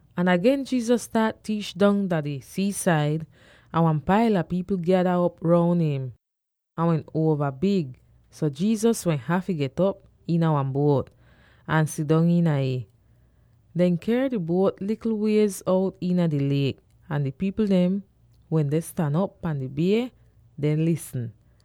Ahn agen Jesus staat tiich dong dah di sii-said. Ahn wan paila pipl gyada op roun im. Ih wehn uova big, so Jesus wehn hafy get'op iina wan buot, ahn sidong iina ih. Dehn ker di buot likl wiez out iina di liek, ahn di pipl dem wende stan op pan di bie deh lisn.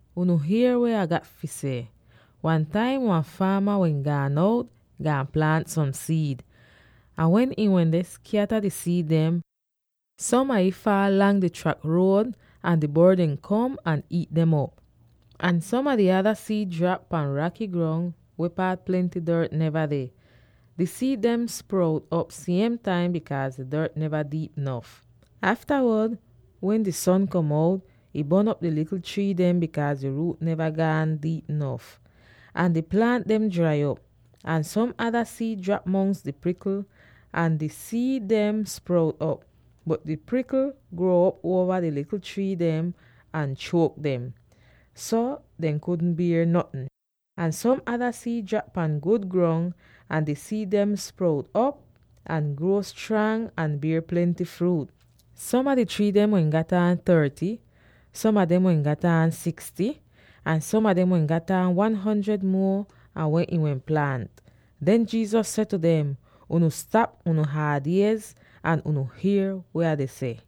“Unu hier weh Ah gat fi seh! Wan taim wan faama wehn gaan out, gaan plaant som siid. Ahn wen ihn wende skyata di siid dem, som a ih faal lang di trak ruod, ahn di bord dem kom ahn iit dem op. Ahn som a di ada siid drap pan raky grong, weh paat plenty dort neva deh. Di siid dem sprout op siem taim bikaaz di dort neva diip nof. Aftawod wen di son kom out, ih bon'op di likl trii dem, bikaaz di ruut neva gaan diip nof, ahn di plaant dem drai op. Ahn som ada siid drap mongs di prikl, ahn di siid dem sprout op, bot di prikl gruo'op uova di likl trii dem ahn chuok dem, so dehn kudn bier notn. Ahn som ada siid drap pan gud grong. Ahn di siid dem sprout op ahn gruo strang ahn bier plenty fruut; som a di trii dem wehn gat aan thirty; som a dem wehn gat aan sixty; ahn som a dem wehn gat aan one hundred muo an weh ihn wehn plaant!” Den Jesus seh tu dem, “Unu stap unu haad iez, ahn unu hier weh Ah deh seh!”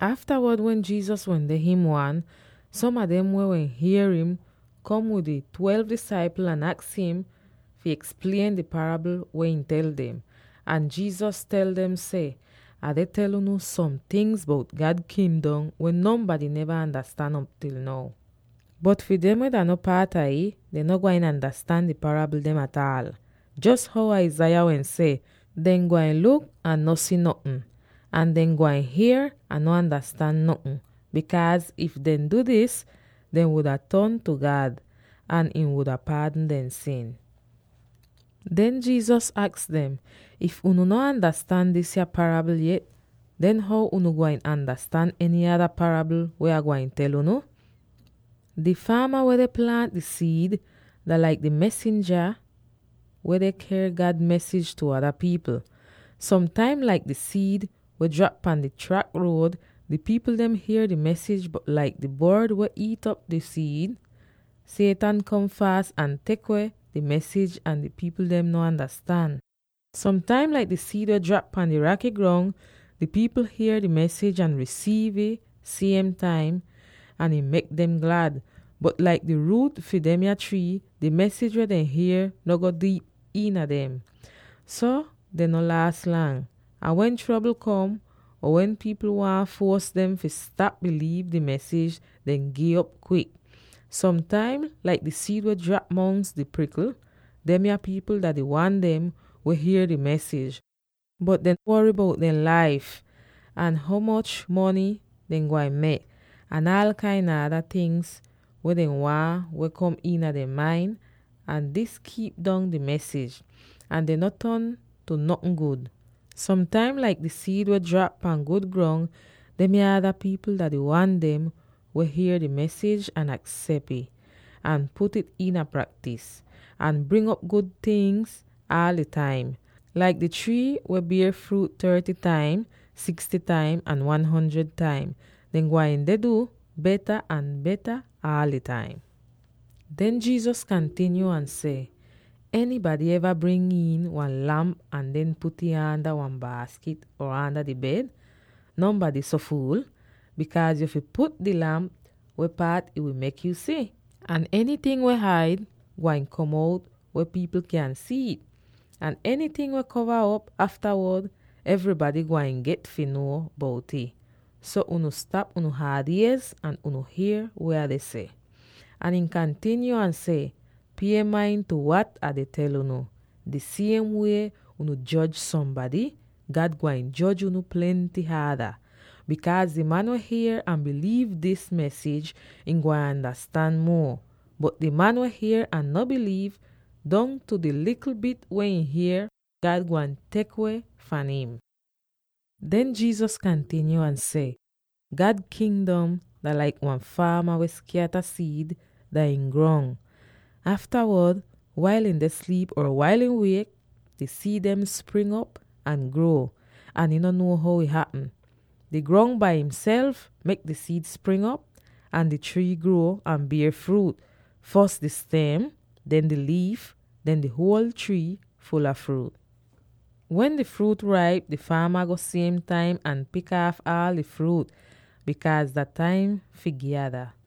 Aftawod wen Jesus wende him wan, som a dem weh wehn hier im, kom wid di twelve disaipl ahn aks im fi eksplien di parabl weh ihn tel dem. Ahn Jesus tel dem seh, “Ah deh tel unu som tingz bout God Kingdom weh nonbady neva andastan op til now. Bot fi dem weh dah no paat a ih, dehn no gwain andastan di parabl dem ataal. Jos how Isaiah wehn seh, ‘Dehn gwain luk, ahn no si notn. Ahn dehn gwain hier, ahn no andastan notn. Bikaaz, if dehn du dis, dehn wuda ton tu God, ahn ihn wuda paadn dehn sin.’” Den Jesus aks dem, “If unu no andastan disya parabl yet, den how unu gwain andastan eny ada parabl weh Ah gwain tel unu? Di faama weh deh plaant di siid, dah laik di mesinja weh deh ker God mesij tu ada pipl. Som taim, laik di siid weh drap pan di trak ruod, di pipl dem hier di mesij, bot laik di bord weh iit'op di siid, Satan kom faas ahn tek weh di mesij ahn di pipl dem no andastan. Som taim, laik di siid weh drap pan di raky grong, di pipl hier di mesij ahn risiiv ih siem taim, ahn ih mek dem glad. Bot laik di ruut fi demya trii, di mesij weh dehn hier no go diip iina dem. So dehn no laas lang, ahn wen trobl kom, or wen pipl waahn fuos dem fi stap biliiv di mesij, dehn gi'op kwik. Som taim, laik di siid weh drap mongs di prikl, demya pipl dah di wan dem weh hier di mesij, bot aftawod dehn wory bout dehn laif, ahn ho moch mony dehn gwain mek, ahn aal kain a ada tingz weh dehn waahn weh kom iina dehn main, ahn dis kiip dong di mesij, ahn dehn no ton tu notn gud. Som taim, laik di siid weh drap pan gud grong demya ada pipl dah di wan dem weh hier di mesij ahn aksep ih, ahn put'ih iina praktis, ahn bring op gud tingz aal di taim, laik di trii weh bier fruut thirty taim, sixty taim, ahn one hundred taim, dehn gwain deh du beta ahn beta aal di taim.” Den Jesus kantinyo ahn seh, “Enybady eva bring iin wan lamp ahn den put'ih aanda wan baaskit or aanda di bed? Nonbady no so fuul, bikaaz yu fi put di lamp weh paat ih wi mek yu si. Ahn enyting weh haid, gwain kom out weh pipl kyan si'it, ahn enyting weh kova op, aftawod evrybady gwain get fi nuo bout'ih. So, unu stap unu haad iez, ahn unu hier weh Ah deh seh!” Ahn ihn kantinyo ahn seh, “Pie main tu wat Ah deh tel unu. Di siem wie unu joj sombady, God gwain joj unu plenty haada. Bikaaz di man weh hier ahn biliiv dis mesij, ihn gwain andastan muo; bot di man weh hier ahn no biliiv, dongtu di likl bit weh ihn hier, God gwain tek weh fahn im.” Den Jesus kantinyo ahn seh, “God Kingdom dah laik wan faama weh skyata siid dah ihn grong. Aftawod, wail ihn deh sliip or wail ihn wiek, di siid dem spring'op ahn gruo, ahn ihn no nuo how ih hapm. Di grong bai ihself mek di siid spring'op ahn di trii gruo, ahn bier fruut: fos di stem, den di liif, den di huol trii ful a fruut. Wen di fruut raip, di faama go siem taim ahn pik aaf aal di fruut, bikaaz dah taim fi gyada.”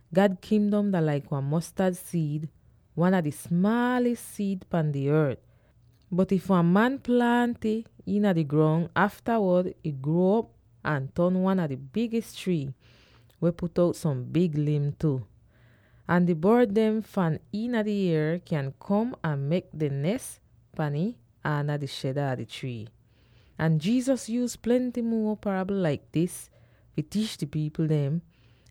God Kingdom dah laik wan mostad siid, wan a di smaalis siid pan di ort. Bot if wan man plaant ih iina di grong, aftawod ih gruo'op ahn ton wan a di bigis trii, weh put out som big lim tu. Ahn di bord dem fahn iina di ier kyan kom ahn mek dehn nes pan ih aanda di sheda a di trii.” Ahn Jesus yuuz plenty muo parabl laik dis fi tiich di pipl dem,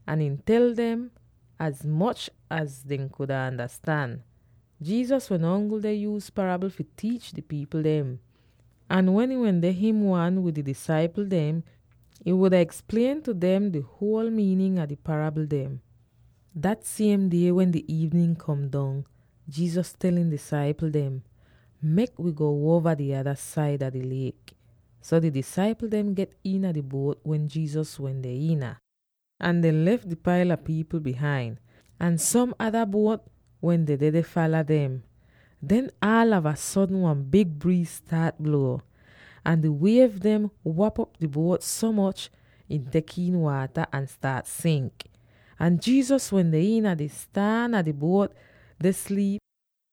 ahn ihn tel dem az moch az dehn kuda andastan. Jesus wehn ongl deh yuuz parabl fi tiich di pipl dem; ahn wen ihn wende him wan wid di disaipl dem, ihn wuda eksplien tu dem di huol miinin a di parabl dem. Dat siem die wen di iivnin kom dong, Jesus tel ihn disaipl dem, “Mek wi go uova di ada saida di liek.” So di disaipl dem get iina di buot weh Jesus wende iina, ahn dehn lef di paila pipl bihain. Ahn som ada buot wehn dedeh deh fala dem. Den aalava sodn wan big briiz staat bluo, ahn di wiev dehn wap'op di buot so moch ih tek iin waata ahn staat sink. Ahn Jesus wende iina di staan a di buot deh sliip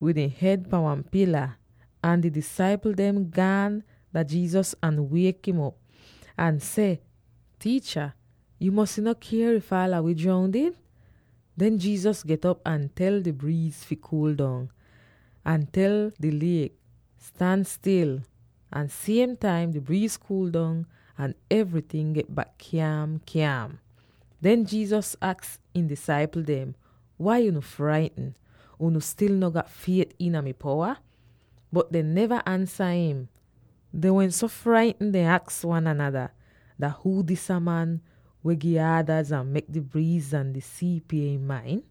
wid ihn hed pan wan pila. Ahn di disaipl dem gaan dah Jesus ahn wiek'im op, ahn seh, “Tiicha, yu mosy no kya if aala wi droundid?” Den Jesus get'op ahn tel di briiz fi kuul dong, ahn tel di liek, “Stan stil!” Ahn siem taim, di briiz kuul dong ahn evryting get bak kyaam-kyaam! Den Jesus aks ihn disaipl dem, “Wai unu fraitn? Unu stil no gat fiet iina mi powa?” Bot dehn neva ansa im. Dehn wehn so fraitn, dehn aks wan anada, “Dah huu disa man weh gi aadaz ahn mek di briiz ahn di sii pie im main?”